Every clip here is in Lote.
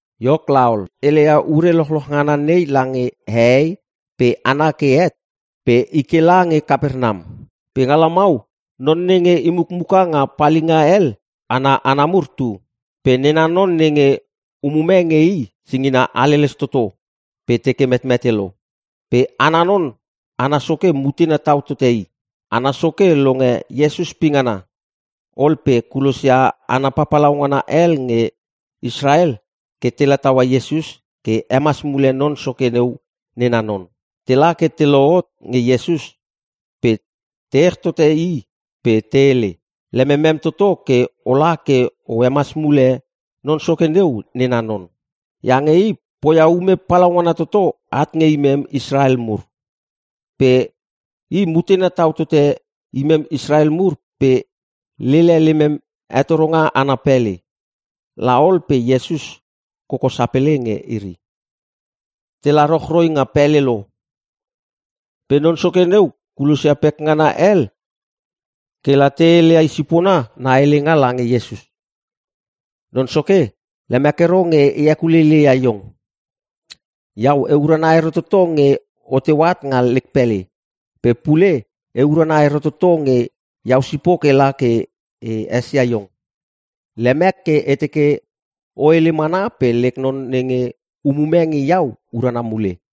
Iok laol, Iesus heleia ure lochloch ngana nei lange hehei pe hana ke het pe i ke lange Kapernam. Pe nga lamau non nenge i mukmuka nga palinga hel ana hana mur tu. Pe nena non nenge umume nge i singina haleles toto pe teke metmete lo. Pe ana non ana soke mutena tau tote i. Ana soke longe Iesus pingana, ol pe kulosia hana papalaungana hel nge Israel ke tela taua Iesus ke hemas mule non soke neu nena non. Tela ke te lohot nge Iesus pe te ech tote i pe te hele, “Lememem toto ke ola ke o hemas mule non soke neu nena non. Iange i poia ume palaungana toto at nge imem Israel mur. Pe i mutena tau tote imem Israel mur pe lele lemem hetoronga ana pele.” La ol pe Iesus koko sapele nge iri. Tela rochroi nga pele lo pe non soke neu kulosia pekngana hel ke la te heleia i sipona na helenga lange Iesus, “Non Soke, lemek ero nge e hekuleileia iong. Iau e urana ero toto nge oteu at nga lek pele. Pe pule e urana ero toto nge iau sipok ela ke e esia iong. Lemek ke e teke o hele mana pe lek non nenge umume nge iau urana mule.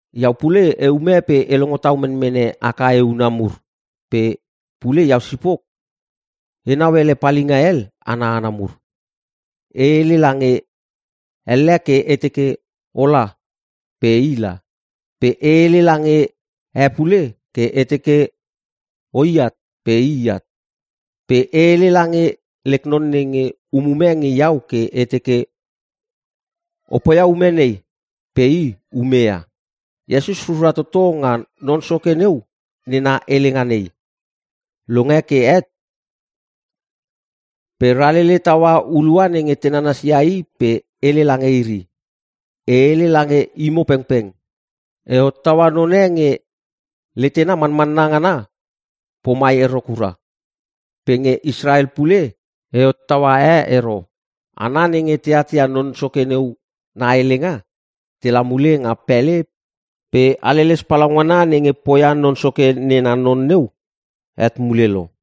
Iau pule eume pe e longo tau menmene ak ae huna mur pe pule iau sipok enau ele palinga hel ana hana mur. E hele lange elle ke e teke, ‘Ola!’ pe ila. Pe e hele lange e pule ke e teke, ‘O i at!’ pe i at. Pe e hele lange lek non nenge umume nge iau ke e teke, ‘O poia ume nei!’ Pe i ume ia.” Iesus rura toto nga Non Soke neu nena helenga nei. Longe ke het pe ralele taua hulua nenge te nananas ia i pe hele lange iri, “E hele lange imo pengpeng, e hottaua none nge letena manmanna ngana pomai ero kura. Pe nge Israel pule e hottaua e ero!” Hana nenge te atia non soke neu na helenga tela mule nga pele pe haleles palaungana nenge poia non soke nena non neu het mule lo.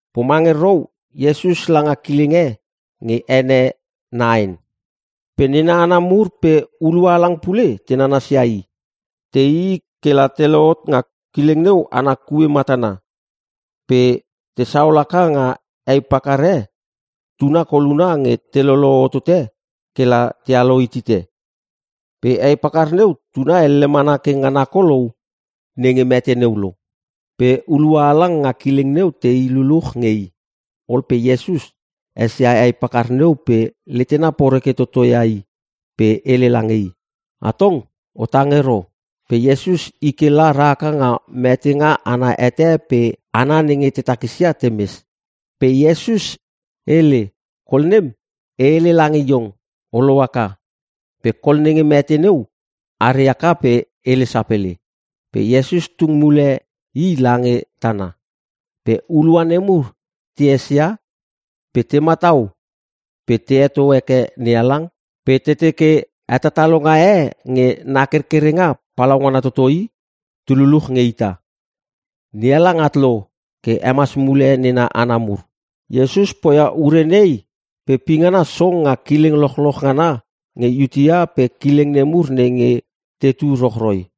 Pomange rou Iesus langa kileng e nge ene Naen. Pe nena hana mur pe hulua halang pule te nanasia i. Te ii ke la te lohot nga kileng neu ana kue matana pe tesaol haka nga hei pakar e tuna koluna nge telolo hotote ke la tealo hitite. Pe hei pakar neu tuna elle mana ke ngana kolou nenge mete neu lo. Pe hulua halang nga kileng neu tei luluch nge i. Ol pe Iesus esia hei pakar neu pe letena poreke toto ia i pe hele lange i, “Atong o tang ero.” Pe Iesus i ke la rahaka nga metenga ana hete pe hana nenge te takisia temes. Pe Iesus hele, “Kol nem! E hele lange iong. O lohaka!” Pe kol nenge mete neu are haka pe hele sapele. Pe Iesus tung mule i lange tana. Pe hulua nemur te esia pe te matau pe te heto heke NeHalang pe te teke, “Hetatalonga e nge na kerkerenga palaungana toto i! Tu luluch nge ita! NeHalang at lo ke hemas mule nena hana mur!” Iesus poia ure nei pe pingana song nga kileng lochloch ngana nge Iutea pe kileng nemur nenge tetu rochroi.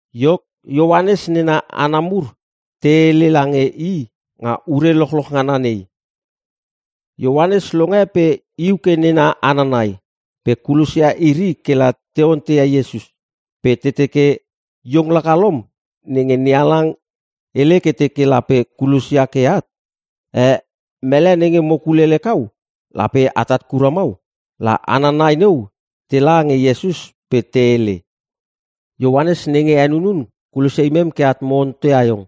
Iok, Ioanes nena hana mur te hele lange i nga ure lochloch ngana nei. Ioanes longe pe iu ke nena hana nai pe kulosia iri kela te onteia Iesus. Pe te teke, “Iong laka lom nenge NeHalang hele ke teke lape kulosia ke at? Eh, Mele nenge mo kulele kau lape atat kura mau?” La hana nai neu tela nge Iesus pe te hele, “Ioanes nenge henunun kulosia imem ke at mo onteia iong.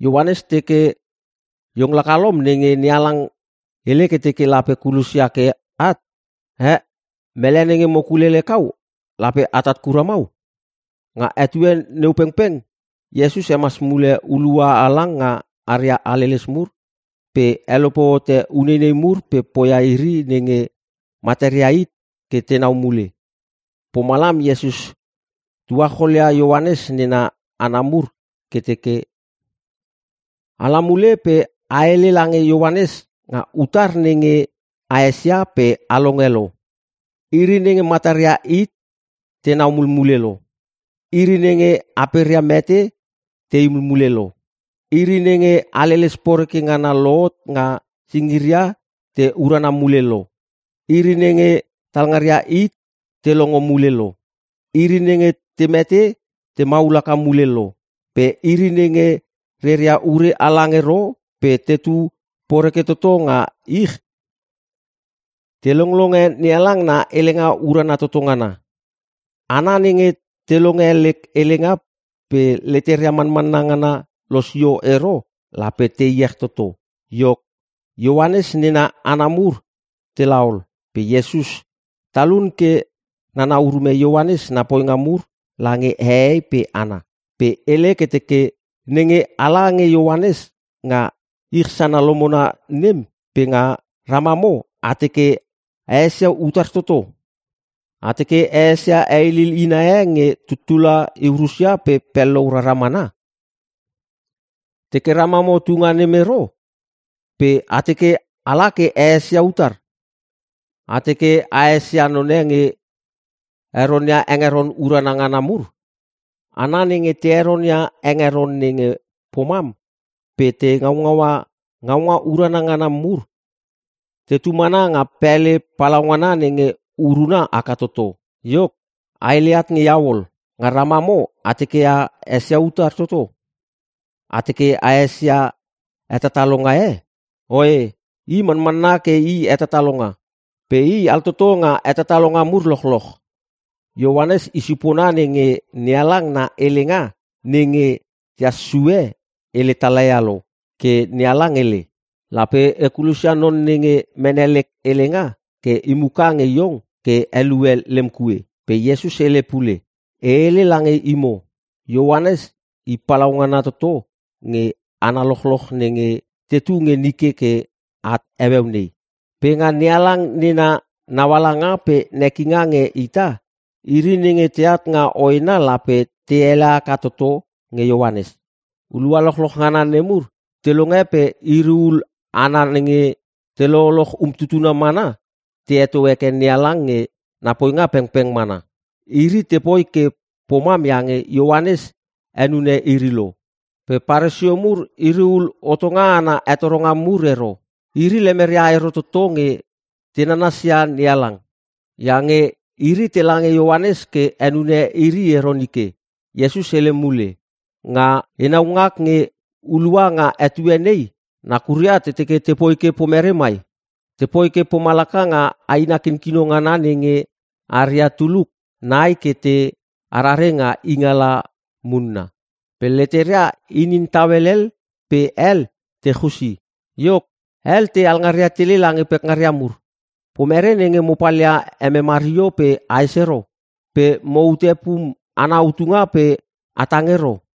Ioanes teke, ‘Iong laka lom nenge NeHalang hele ke teke lape kulosia ke at? Eh, Mele nenge mo kulele kau? Lape atat kura mau?’” Nga etue neu pengpeng Iesus hemas mule hulua halang nga aria haleles mur pe helope hote uneinei mur pe poia iri nenge mataria hit ke tenau mule. Pomalam Iesus tuacholia Ioanes nena hana mur ke teke, “Ala mule pe a hele lange Ioanes nga utar nenge a esia pe a longe lo. Iri nenge mataria hit tenau mulmule lo. Iri nenge aperia mete tei mulmule lo. Iri nenge haleles poreke ngana lohot nga singiria te urana mule lo. Iri nenge talngaria hit te longo mule lo. Iri nenge te mete te maul haka mule lo. Pe iri nenge reria ure halang ero pe tetu poreke toto nga ich te longlonge NeHalang na helenga urana toto ngana. Hana nenge te longe lek helenga pe leteria manmanna ngana losio ero lape te iech toto!” Iok, Ioanes nena hana mur tela ol pe Iesus talun ke nana urume Ioanes na poinga mur lange hehei pe hana. Pe hele ke teke, “Nenge ala nge Ioanes nga ich sana lomona nem pe nga ramamo a teke a esia utar toto? A teke a esia heilil ina a nge tutula iu rusia pe pellou rara mana? Teke ramamo tunga nem ero pe a teke ala ke a esia utar? A teke A esia none nge heronia hengeron urana ngana mur? Hana nenge te heronia hengeron nenge pomam pe te ngaungaua ngaunga urana ngana mur tetu mana nga pele palaungana nenge uruna haka toto! Iok, a hele at nge iau ol. Nga ramamo a teke a esia utar toto? A teke a esia hetatalonga e? Oe i manmanna ke i hetatalonga. Pe i altoto nga hetatalonga mur lochloch. Ioanes i sipona nenge NeHalang na helenga nenge tehas sue hele tala ia lo. Ke NeHalang hele, “‘Lape e kulosia non nenge mene lek helenga ke imuka nge iong ke helue lem kue.’” Pe Iesus hele pule, “E hele lange imo, Ioanes i palaungana toto nge hana lochloch nenge tetu nge nike ke at heueu nei. Pe nga NeHalang nena naualanga pe nekinga nge ita, iri nenge teat nga hoena lape te ele haka toto nge Ioanes.” Hulua lochloch ngana nemur te longe pe iri ul hana nenge te lololoch umtutuna mana te heto heke NeHalang nge na poinga pengpeng mana. Iri te poi ke pomam iange Ioanes henune iri lo. Pe Paresio mur iri ul hotonga ana hetoronga mur ero. Iri lemeria ero toto nge te nanasia NeHalang. Iange iri tela nge Ioanes ke henune iri ero nike. Iesus hele mule, “Nga enau ngak nge hulua nga etue nei nakuria te teke tepoi ke pomere mai? Tepoi ke pomalaka nga aina kinkino ngana nenge aria tuluk nai ke te arare nga ingala munna. Pe leteria inin tau helel pe hel te chusi. Iok, hel te alngaria tele lange pekngaria mur, “‘Pomere nenge mo palia emem hario pe ahes ero? Pe moute pum ana utunga pe a tang ero?’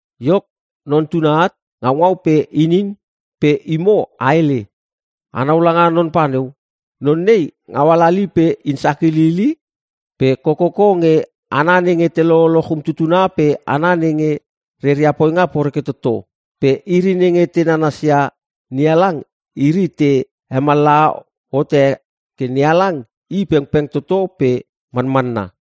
Iok, Non Tuna at. Ngaungau pe inin pe imo a hele, ‘Anau langa non pa neu! Non nei ngau halali! Pe in sakilil i! Pe kokoko nge hana nenge te lololoch umtutuna pe hana nenge reria poinga poreke toto!’ Pe iri nenge te nanasia NeHalang iri te hemallaha hote ke NeHalang i pengpeng toto pe manmanna.”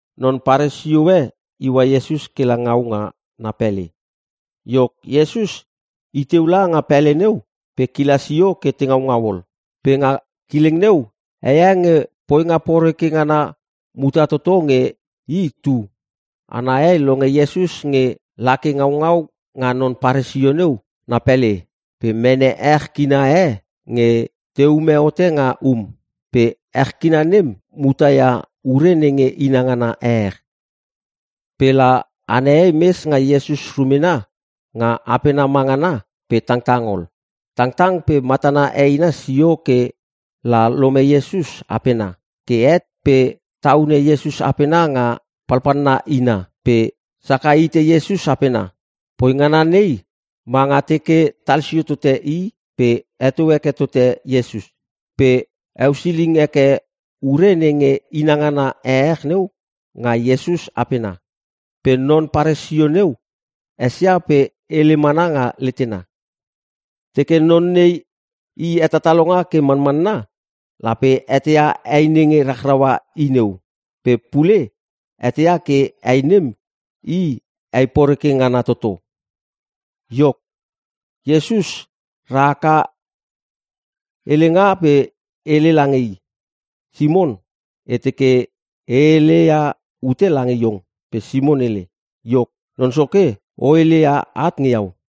Non Paresio e iua Iesus kela ngau nga na pele. Iok Iesus iteu langa pele neu pe kila sio ke te ngaungau ol. Pe nga kileng neu heie nge poinga poreke ngana muta toto nge i tu. Ana hei longe Iesus nge lake ngaungau nga non Paresio neu na pele pe mene ech kina e nge te ume hote nga um. Pe ech kina nem muta ia ure nenge inangana ehech. Pe la ana hei mes nga Iesus rumena nga apena mangana pe tangtang ol. Tangtang pe matana eina sio ke la lome Iesus apena. Ke het pe taune Iesus apena nga palpalna ina pe saka hite Iesus apena. (poi ngana nei, manga teke talsio tote i pe heto heke tote Iesus) Pe heusiling heke ure nenge inangana ehech neu nga Iesus apena. Pe non Paresio neu esia pe hele mana nga letena, “Teke non nei i hetatalonga ke manmanna lape eteia hei nenge rachraua i neu. Pe pule eteia ke hei nem i hei poreke ngana toto.” Iok, Iesus rahaka helenga pe hele lange i, “Simon, e teke e hele ia ute lange iong.” Pe Simon hele, “Iok, Non Soke, o hele ia at nge iau.”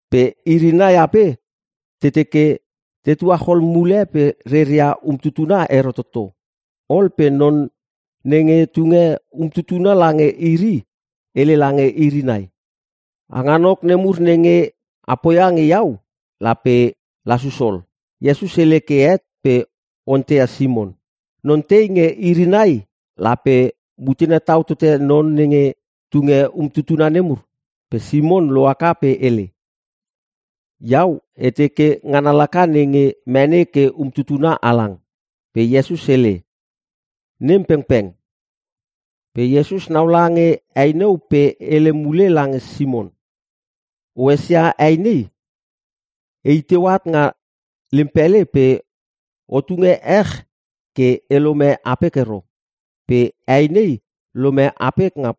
Pe iri nai ape te teke te tuachol mule pe reria umtutuna ero toto. Ol pe non nenge tunge umtutuna lange iri hele lange iri nai, ‘Hanganok nemur nenge a poia nge iau lape lasus ol.’” Iesus hele ke het pe onteia Simon, “Non tei nge iri nai lape mutena tau tote non nenge tunge umtutuna nemur?” Pe Simon lohaka pe hele, “Iau e teke ngana laka nenge mene ke umtutuna halang.” Pe Iesus hele, “Nem pengpeng.” Pe Iesus naula nge hei neu pe hele mule lange Simon, “O esia hei nei? E i teu at nga lem pele pe o tunge ech ke e lome apek ero. Pe hei nei lome apek nga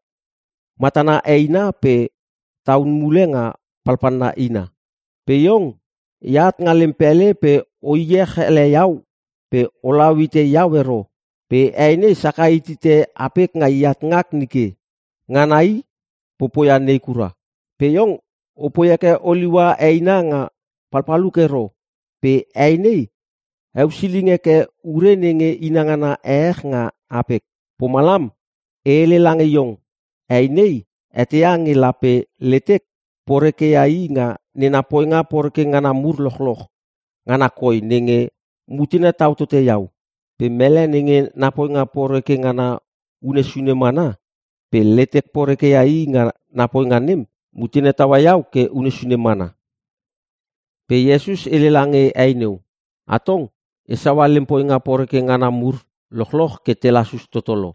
matana heina pe taune mule nga palpalna ina. Pe iong, eat nga lem pele pe o iech ele iau pe olau hite iau ero pe hei nei saka hitite apek nga eat ngak nike. Ngana i popoia ne kura. Pe iong opoi heke oliua eina nga palpaluk ero pe hei nei heusiling heke ure nenge inangana ehech nga apek. Pomalam e hele lange iong hei nei eteia nge lape letek poreke ia i nga nena poinga poreke ngana mur lochloch ngana koi nenge mutena tau tote iau. Pe mele nenge na poinga poreke ngana unne sune mana pe letek poreke ia i nga na poinga nem mutena taua iau ke unne sune mana.” Pe Iesus hele lange hei neu, “Atong, e saua lem poinga poreke ngana mur lochloch ke te lasus toto lo.”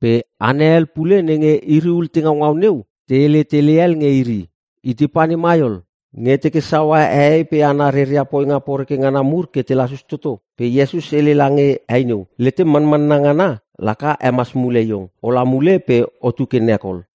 Pe hana hel pule nenge iri ul te ngaungau neu te hele tele hel nge iri, “Itei pane mai ol, nge teke saua hehei pe hana reria poinga poreke ngana mur ke te lasus toto?” Pe Iesus hele lange hei neu, “Letem manmanna ngana laka hemas mule iong. Ola mule pe otu ke nek ol.”